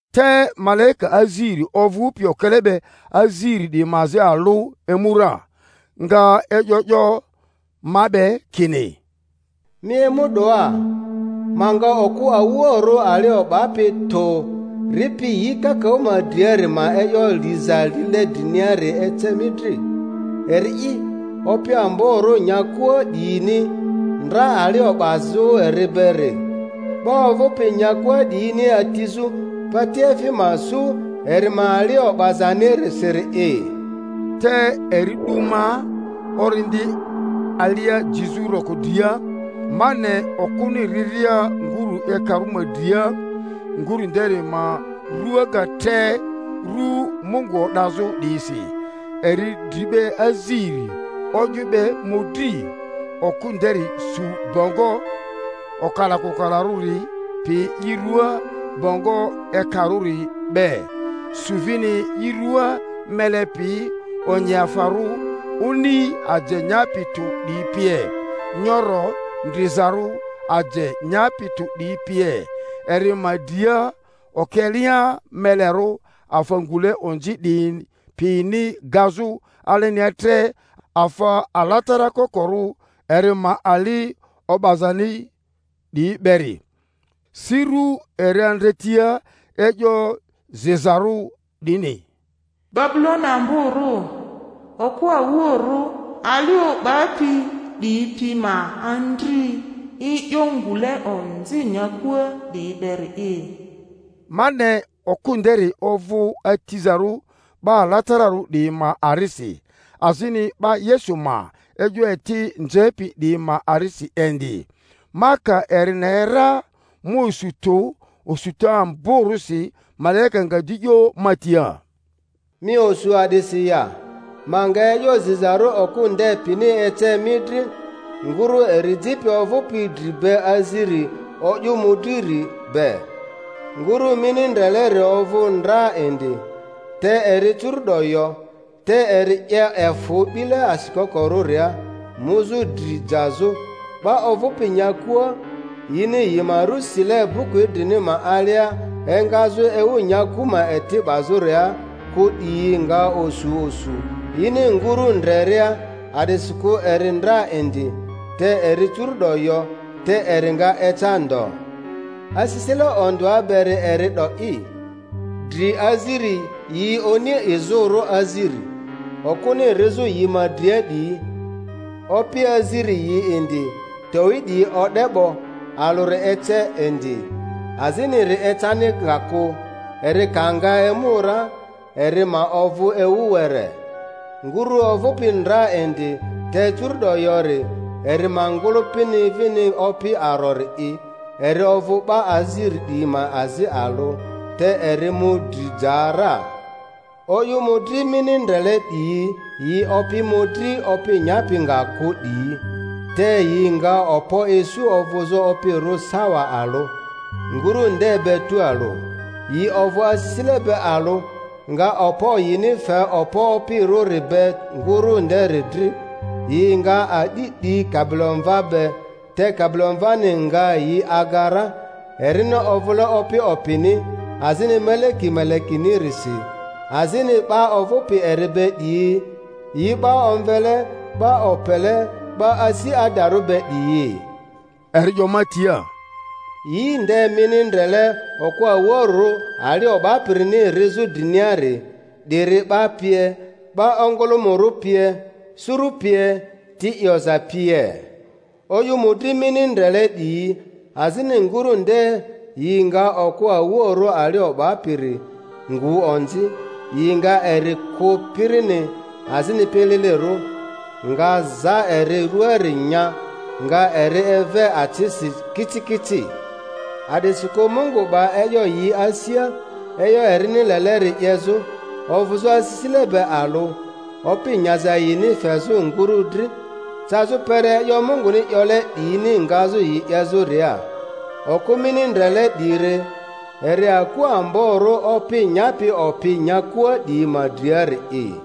Te malaika aziri ovᴜpi okele be aziri 'diyi ma azi alᴜ emu ra, nga e'yo 'yo ma be kini, Mi emu 'doa, ma nga okᴜ awuoᴜrᴜ ali o'bapi tᴜ ripi yi kakaᴜ ma driari ma e'yo liza lile driniari ece mi dri; eri'i opi amborᴜ nyakua 'diyini ndra ali o'bazᴜ eri beri, 'ba ovᴜpi nyakua 'diyini atizᴜ patiefi ma su eri ma ali o'bazanirisiri'i. Te eri 'du ma Orindi alia jizᴜ roko dria, ma ne okᴜni riria ngurᴜ ekarᴜ ma dria.. nguru nderi ma rua ga tre rᴜ Mungu o'dazᴜ 'diyisi, eri dri be aziri, o'yᴜ be mᴜdri. Okᴜ nderi su bongo okalakokalarᴜri pi i ruaa bongo ekarᴜri be, su vini i ruaa mele pi onyiafarᴜ, oni aje nyapi tᴜ 'diyi pie, nyoro ndrizarᴜ aje nyapi tᴜ 'diyi pie, eri ma dria okelea melerᴜ afa ngule onzi 'diyi pini gazᴜ alenia tre afa alatara kokorᴜ eri ma ali o'bazani 'diyi beri; si rᴜ eri andretia e'yo zizarᴜ 'dini: BABULONI AMBORU, OKU AWUOURU ALI O'BAPI 'DIYI PI MA ANDRI E'YO NGULE ONZI NYAKUA 'DIYI BERI'I. Ma ne okᴜ nderi ovᴜ atizarᴜ 'ba alatararᴜ 'diyi ma arisi, azini 'ba Yesu ma e'yo eti. nzepi 'diyi ma arisi indi. Ma ka eri ne ra, ma osu tᴜ osuta amborᴜsi. Malaika nga di 'yo ma tia, Mi osu a'disi ya? Ma nga e'yo zizarᴜ okᴜ nde pini ece mi dri, nguru eri jipi ovᴜpi dri be aziri o'yᴜ mᴜdriri be. Nguru mini ndreleri ovᴜ ndra indi, te eri curu'do yo, te eri 'ye efᴜ 'bile asikokorᴜria muzᴜ dri jazᴜ; 'ba ovᴜpi nyakua, yini yi ma rᴜ sile buku idrini ma alia engazᴜ ewu nyaku ma eti 'bazᴜria kᴜ 'diyi nga osu osu yini nguru ndreria, a'disikᴜ eri ndra indi, te eri curu’do yo, te eri nga eca ndo. Asisile ondᴜa beri eri 'do'i: dri aziri yi oni izᴜrᴜ aziri, okᴜni rizᴜ yi ma dria 'diyi; opi aziri yi indi, towi 'diyi o'de 'bo, alᴜri ace indi, aziniri ecani nga kᴜ; eri ka nga emu ra eri ma ovᴜ ewu were. Nguru ovᴜpi ndra indi te curu’do yori, eri ma ngᴜlᴜpi vini opi arori'i, eri ovᴜ 'ba aziri 'diyi ma azi alᴜ, te eri mu dri ja ra. O'yᴜ mᴜdri mini ndrele 'diyi yi opi mᴜdri opi nyapi nga kᴜ 'diyi, te yi nga okpo isu ovᴜzᴜ opirᴜ sawa alᴜ, nguru nde be tualᴜ. Yi ovᴜ asisile be alᴜ, nga okpo yini fe okpo opirᴜri be nguru nderi dri; yi nga a'di 'di Kabilomva be, te Kabilomvani nga yi aga ra, erini ovᴜle Opi opini azini Meleki melekinirisi, azini 'ba ovᴜpi eri be 'diyi yi 'ba omvele, 'ba opele, 'ba asi adarᴜ be 'diyi. Eri 'yo ma tia, Yi nde mini ndrele okᴜ awuoᴜrᴜ ali o'bapirini rizᴜ driniari, 'diri 'ba pie, 'ba ongᴜlᴜmᴜrᴜ pie, suru pie, ti 'yoza pie. O'yᴜ mᴜdri mini ndrele 'diyi azini nguru nde yi nga okᴜ awuoᴜrᴜ ali o'bapiri ngu onzi; yi nga eri kᴜ pirini azini pililirᴜ, nga za eri rᴜaari nya, nga eri eve acisi kicikici, a'disikᴜ Mungu 'ba e'yo yi asia e'yo erini leleri 'yezᴜ, ovᴜzᴜ asisile be alᴜ, opi nyaza yini fezᴜ nguru dri, cazᴜ kpere e'yo Munguni 'yole 'diyini ngazᴜ yi 'yezᴜria. Okᴜ mini ndrele 'diri eri aku amborᴜ opi nyapi opi nyakua 'diyi ma driari'i.